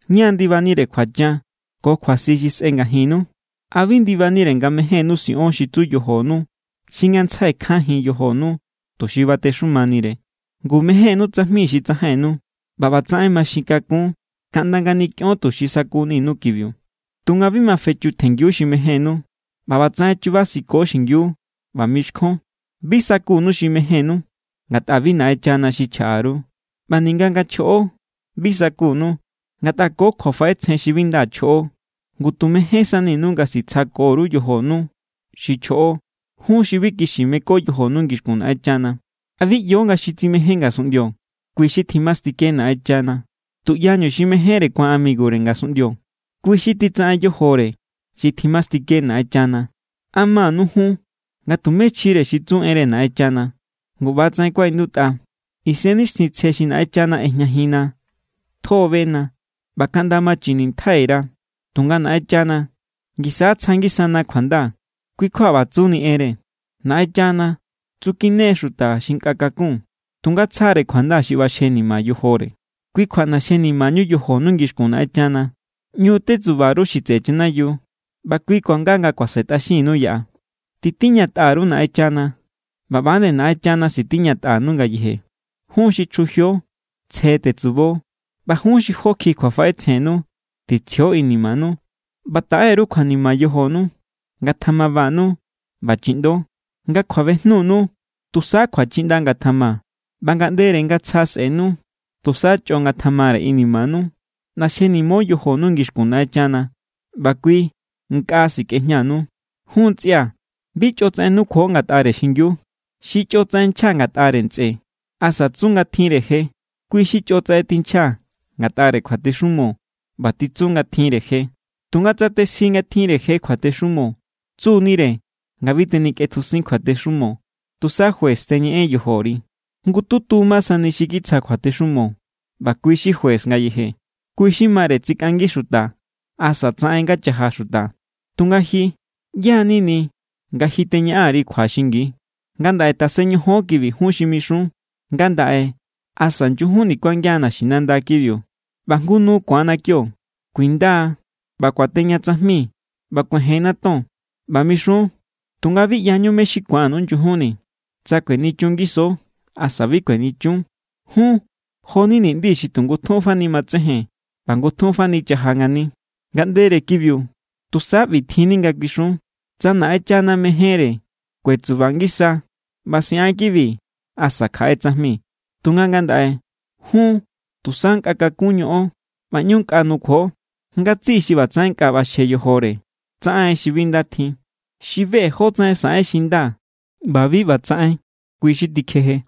¿Ñá= ndibanire kjuachan ko kjuasi xi sꞌe ngajinnu? ¿A bi ndibanire nga mejénnu siꞌon xi tsu yojonu xi ngantsjai kjanjin yojonu tuxi batexumanire? Ngu mejénnu tsajmi xi tsajainnu. ꞌBa ꞌbatsaꞌen maxin kakun kaꞌnda nga nikꞌion tuxi sa̱kuni=nu kibiu, tunga bi ma fechutjenngiu xi mejénnu. ꞌBa ꞌbatsaꞌen chubasiko xingiu ꞌba mixkjon. Bi sakunu xi mejénnu, ngatꞌa bi Naꞌenchana xi chjaꞌa_ru. ꞌBa ninga nga chjoꞌo, bi sakunu, ngatꞌa ko kjuafaꞌetsjen xi bi nda chjoꞌo. Ngu tu mejénsaninu nga sitsjako_ru yojonu xi chjoꞌo. ¡Jun xi bi kixi meko yojonu ngixkun Naꞌenchana! ¿A bi ꞌyo nga xi tsimején ngasunꞌndio, kui xi tjimastike Naꞌenchana? Tuꞌyañu xi mejénre ku̱an amigure ngasunꞌndio, kui xi titsaꞌen yojore xi tjimastike Naꞌenchana. ¿A manu jun nga tumé chjire xi tsu enre Naꞌenchana? Ngu ꞌbatsaꞌen kuaꞌindutꞌa: “Isennixtjintsje xi Naꞌenchana ꞌejñajinna tjo= bena ꞌba kaꞌnda machinintjai_ra.” Tunga Naꞌenchana= ngisa tsja ngisana kjuanda. Kui= kjua ꞌba tsuni enre: “Naꞌenchana tsukine= xuta xi nkꞌa kakun, tunga tsjare kjuanda xi ꞌbaxjenima yojore.” Kui kjua ꞌnaxjenimañu yojonu ngixkun Naꞌenchana. ꞌÑu tetsuba_ru mé= xi tseꞌe chanayiu, ꞌba kui kuanga nga kuasentꞌaxinnu yaꞌa. Titiñatꞌa_ru Naꞌenchana, ꞌba ꞌba=nde Naꞌenchana sitiñatꞌanu ngayeje. Jun xi chjujio, tsje tetsubo. ꞌBa jun xi jó kjiꞌi kjuafaꞌetsjennu, titsjio inimanu. ꞌBa taꞌe_ru kjuanima yojonu, ngatjamabanu ꞌba chiꞌndo. Nga kjuabejnunu, tusa kjuachiꞌnda ngatjama ꞌba ngaꞌndere nga tsja sꞌe̱nu, tusa chꞌo ngatjamare inimanu. ꞌNaxjenimo yojonu ngixkun Naꞌenchana, ꞌba kui nkꞌa sikꞌejñanu. Jun ntsꞌia̱, bi chꞌotsaꞌen nukjuo ngatꞌare xingiu. Xi chꞌotsaꞌen nchja ngatꞌare ntsꞌe asa tsu nga tjinre je, kui xi chꞌotsaꞌen tinchja ngatꞌare kjuatexumo ꞌba titsu nga tjinre je. Tunga tsa tesji nga tjinre je kjuatexumo, tsu=nire nga bi tenikꞌetjusin kjuatexumo, tusa juez teñeꞌen yojori. Jngututu ma sani xi kitsja kjuatexumo ꞌba kui xi juez ngayeje. Kui xi mare tsikꞌangi xuta asa tsaꞌen nga chaja xuta. Tunga ji, ¿ꞌyá= nini nga ji teñaꞌan_ri kjua xingi? Ngandaꞌe tasen ñojon kibi jun xi mixun: “Ngandaꞌe asa nyujunni kuangian naxinanda kibiu ꞌba jngu nu ku̱anna kio. Kuinda ꞌba kuateña tsajmi ꞌba kuejenna ton.” ꞌBa mixun, tunga bi ꞌyañu mé= xi ku̱annu nyujunni, tsa kuenichun ngiso asa bi kuenichun. Jun jo=ni ni̱ꞌndi xi ngutjun fani matsejen ꞌba ngutjun fani chaja ngani. Ngaꞌndere kibiu, tusa ꞌbi= tjinni nga kuixun: “Tsa Naꞌenchana mejénre, kuetsuba ngisa ꞌba siꞌan kibi asa kjaꞌe tsajmi.” Tunga ngandaꞌe, jun tusa nkꞌa kakun ñoꞌon ꞌba ꞌñu nkꞌa nukjuo. Ngatsiꞌi xi ꞌbatsaꞌen nkꞌa ꞌbaxje yojore tsaꞌen xi bi nda tjin. Xi be= jótsaꞌen saꞌen xi nda ꞌba bi ꞌba tsaꞌen, kui xi tikjeje.